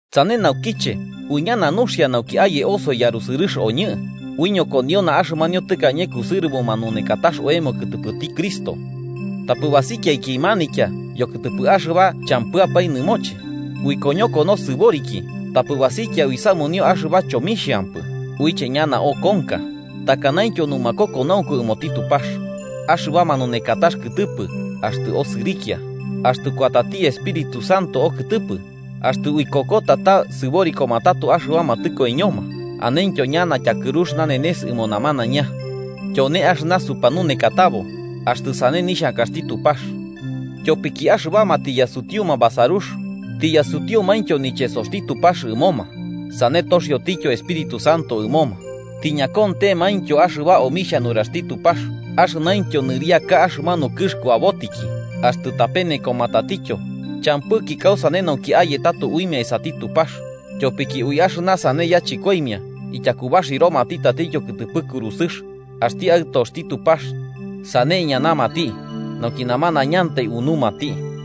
Sane naukiche uiñana nuxia nauki aye osoi yarusɨrɨx oñɨ, uiñokoniona axɨmanio tɨkañe kusɨrɨbo manunekatax oemo kɨtɨpɨti Cristo. Tapɨ basikiaki manitya yokɨtɨpɨ axɨba champɨapae nɨmoche, uikoñoko nosɨboriki tapɨ basikia uisamunio axɨba chomixhampɨ uiche ñana okonka, takanaintyo numakokonaunku ɨmoti Tupax, axɨba manunekatax kɨtɨpɨ axtɨ osɨrikia, axtɨ kuatati Espíritu Santo okɨtɨpɨ, axtɨ uikokota ta sɨborikoma tato axɨbama tɨkoiñoma, anentyo ñana tyakɨrux nanenes ɨmo namanaiña. Tyone axɨna supanunekatabo, axtɨ sane nixhankaxti Tupax. Tyopiki axɨbama tiyasutiuma basarux, tiyasutiumaintyo nichesoxti Tupax ɨmoma, sane toxioityo Espíritu Santo ɨmoma, tiñakontemaintyo axɨba omixhia nuraxti Tupax axɨnaintyo nɨriaka axɨmanu kɨx kuabotiki, axtɨ tapenekoma tatityo, champɨki kausane nauki aye tato uimia esati Tupax, tyopiki ui axɨna sane yachɨkoimia ityakubaxiromati tatityo kɨtɨpɨ kurusɨx axti Aɨtoxti Tupax sane iñanamati nauki namanañantai unumati.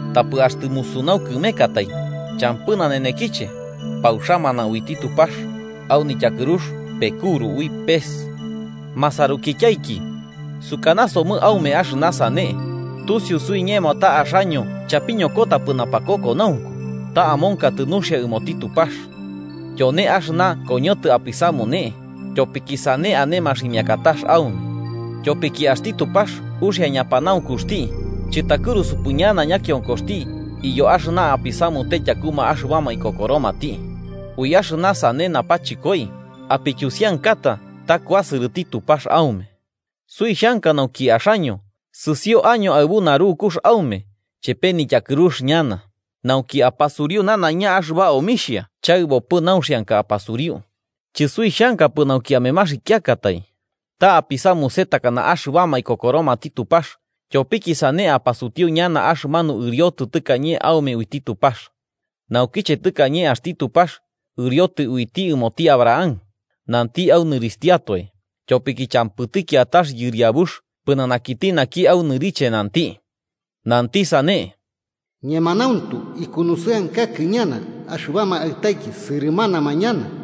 Tapɨ axtɨ musunau kɨmekatai, champɨ nanenekiche, pauxamana uiti Tupax, au nityakɨrux pekuru ui pes. Masarukityaiki, sukanasomɨ aume axɨna sane, tusiu suiñemo ta axaño chapiñokotapɨ napakokonaunku, ta amonkatɨ nuxia ɨmoti Tupax. Tyone axɨna koñotɨ apisamune, tyopiki sane ane maximiakatax aume. Tyopiki axti Tupax uxia ñapanaunkuxti chɨtakɨrusupɨ ñana ñakionkoxti iyo axɨna apisamute tyakuma axɨbama ikokoromati. Ui axɨna sane napachɨkoi apityusiankata ta kuasɨrɨti Tupax aume. Suixhanka nauki axaño sɨsio año aɨbu narukux aume chepe nityakɨrux ñana, nauki apasuriu nanaiña axɨba omixhia chaɨbopɨ nauxianka apasuriu. Chɨsuixhankapɨ nauki amemaxikiakatai. Ta apisamuse takana axɨbama ikokoromati Tupax, tyopiki sane apasutiu ñana axɨmanu ɨriotɨ tɨkañe aume uiti Tupax. Naukiche tɨkañe axti Tupax ɨriotɨ uiti ɨmoti Abraham, nanti au nɨrixhtiatoe, tyopiki champɨti kiatax yɨriabux pɨnanakiti naki au nɨriche nanti. Nanti sane: “Ñemanauntu, ikunusɨankakɨ ñana axɨbama aɨtaiki sɨrɨmanama ñana.”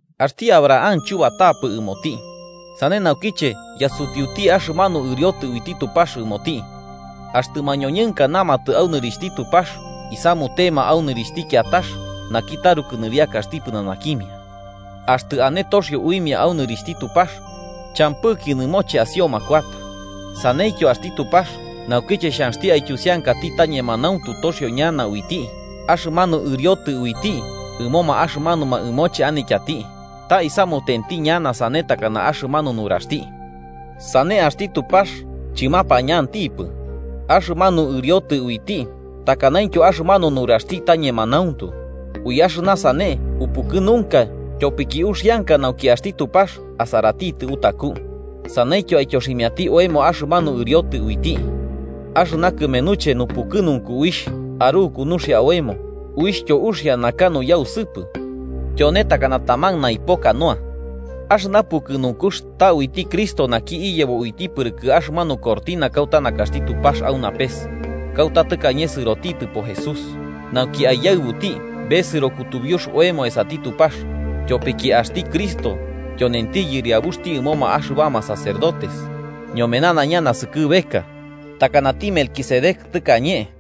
Axti Abraham chubatapɨ ɨmoti, sane naukiche yasutiuti axɨmanu ɨriotɨ uiti Tupax ɨmoti. Axtɨ mañoñɨnka namatɨ au nɨrixhti Tupax isamutema au nɨrixhti kiatax naki taruku nɨriakaxti pɨnanakimia. Axtɨ ane toxio uimia au nɨrixhti Tupax, champɨki nɨmoche asioma kuata. Saneityo axti Tupax, naukiche xhanxti aityusiankati ta ñemanauntu toxio ñana uiti axɨmanu ɨriotɨ uiti ɨmoma axɨmanuma ɨmoche anityati, ta isamutenti ñana sane takana axɨmanu nuraxti. Sane, axti Tupax chɨmapañantipɨ, axɨmanu ɨriotɨ uiti takanaintyo axɨmanu nuraxti ta ñemanauntu. Ui axɨna sane upukɨnunka tyopiki uxianka nauki axti Tupax asaratitɨ utaku, saneityo aityoximiati oemo axɨmanu ɨriotɨ uiti. Axɨna kɨmenuche nupukɨnunku uixh aruku nuxia oemo, uixhtyo uxia naka nuyausɨpɨ, tyone takana taman naipo canoa. Axɨna pukɨnunkux ta uiti Cristo naki iyebo uiti pɨrɨkɨ axɨmanu cortina kauta nakaxti Tupax au napes, kauta tɨkañe sɨrotitɨpo Jesús nauki aiyaɨbuti besɨro kutubiux oemo esati Tupax, tyopiki axti Cristo tyonenti yɨriabuxti ɨmoma axɨbama sacerdotes ñome nanaiña naskɨbeka takanati Melquisedec tɨkañe.